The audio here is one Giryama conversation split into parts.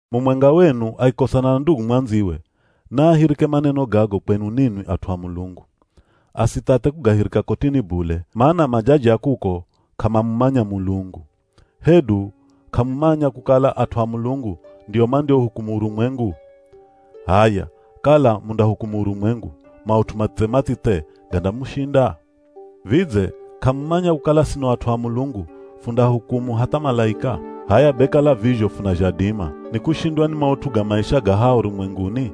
Mumwenga wenu akikosana na ndugu mwandziwe, naahirike maneno gago kwenu ninwi at'u a Mulungu. Asithathe kugahirika kotini bule mana majaji a kuko k'amamumanya Mulungu. Hedu k'amumanya kukala at'u a Mulungu ndio mandiohukumu urumwengu? H'aya kala mundahukumu urumwengu, maut'u mathithe-mathithe gandamushinda? Vidze k'amumanya kukala sino at'u a Mulungu fundahukumu hatha malaika? H'aya be kala vizho funazhadima ni kushindwa ni maut'u ga maisha ga haha urumwenguni?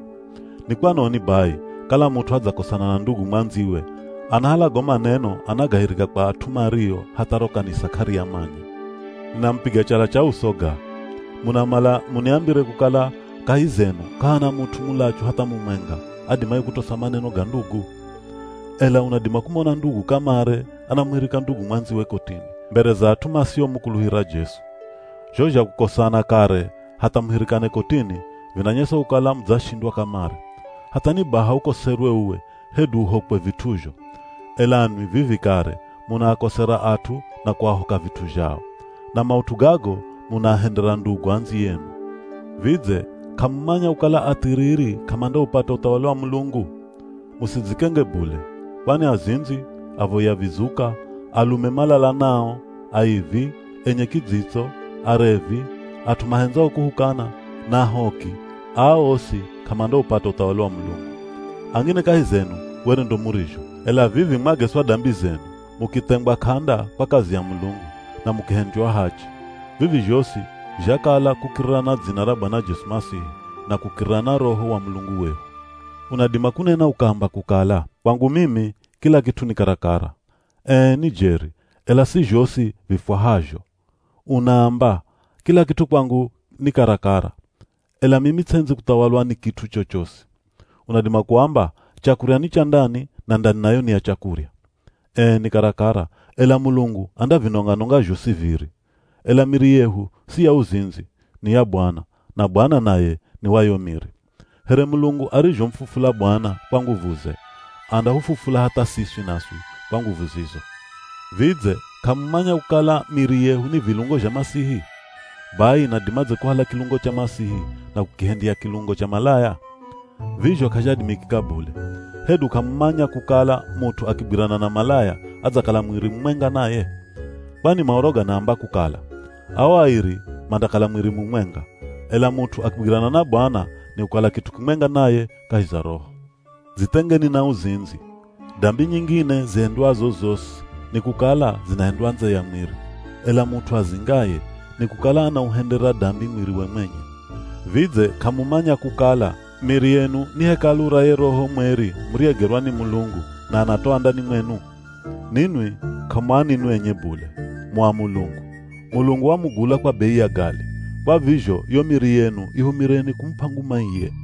Ni kwanoni bai, kala mut'u adzakosana na ndugu mwandziwe anahala go maneno anagahirika kwa at'u mario hatha ro kanisa k'ariamanya? Ninamupiga chala cha uso ga. Munamala muniambire kukala kahi zenu k'ahana mut'u mulachu hatha mumwenga adimaye kutosa maneno ga ndugu? Ela unadima kumona ndugu kamare anamuhirika ndugu mwandziwe kotini, mbere za at'u masiomukuluhira Jesu. Zho zha kukosana kare hatha muhirikane kotini vinanyesa kukala mudzashindwa kamare. Hatha ni baha ukoserwe uwe, hedu uhokwe vit'uzho. Ela nwi vivi kare munaakosera at'u na kuahoka vit'u zhao. Na maut'u gago munaahendera ndugu andziyenu! Vidze, k'amumanya kukala athiriri k'amandaupata uthawali wa Mulungu? Musidzikenge bule, kwani azindzi, avoyi a vizuka, alume malalanao, aivi, enye kidzitso, arevi, at'u mahendzao kuhukana, na ahoki, aa osi k'amandaupata uthawali wa Mulungu. Angine kahi zenu were ndo murizho, ela vivi mwageswa dambi zenu, mukithengwa k'anda kwa kazi ya Mulungu, na mukihendywa ahachi. Vivi zhosi zhakala kukirira na dzina ra Bwana Jesu Masihi, na kukirira na Roho wa Mulungu wehu. Unadima kunena ukaamba kukala, “Kwangu mimi kila kit'u ni karakara.” Ee ni jeri, ela si zhosi vifwahazho! Unaamba, “Kila kit'u kwangu ni karakara.” Ela mimi ts'endzi kuthawalwa ni kit'u chochosi. Unadima kuamba, “Chakurya ni cha ndani, na ndani nayo ni ya chakurya.” Ee ni karakara, ela Mulungu andavinonga-nonga zhosi viri. Ela miri yehu si ya uzindzi, ni ya Bwana, na Bwana naye ni wa yo miri. Here Mulungu arizhomufufula Bwana kwa nguvuze, andahufufula hatha siswi naswi kwa nguvu zizo. Vidze, k'amumanya kukala miri yehu ni vilungo zha Masihi? Bai nadimadze kuhala kilungo cha Masihi na kukihendya kilungo cha malaya? Vizho k'azhadimikika bule. Hedu k'amumanya kukala mut'u akigwirana na malaya adzakala mwiri mumwenga naye? Kwani Maoro ganaamba kukala, “Ao airi mandakala mwiri mumwenga.” Ela mut'u akigwirana na Bwana nikukala kit'u kimwenga naye kahi za Roho. Dzithengeni na uzindzi. Dambi nyingine zihendwazo zosi, nikukala zinahendwa ndze ya mwiri. Ela mut'u azingaye nikukala anauhendera dambi mwiriwe mwenye. Vidze k'amumanya kukala miri yenu ni hekalu ra ye Roho Mweri muriyegerwa ni Mulungu, na anatoa ndani mwenu? Ninwi k'amua ninwi enye bule, mu a Mulungu. Mulungu wamugula kwa bei ya gali, kwa vizho yo miri yenu ihumireni kumup'a nguma iye.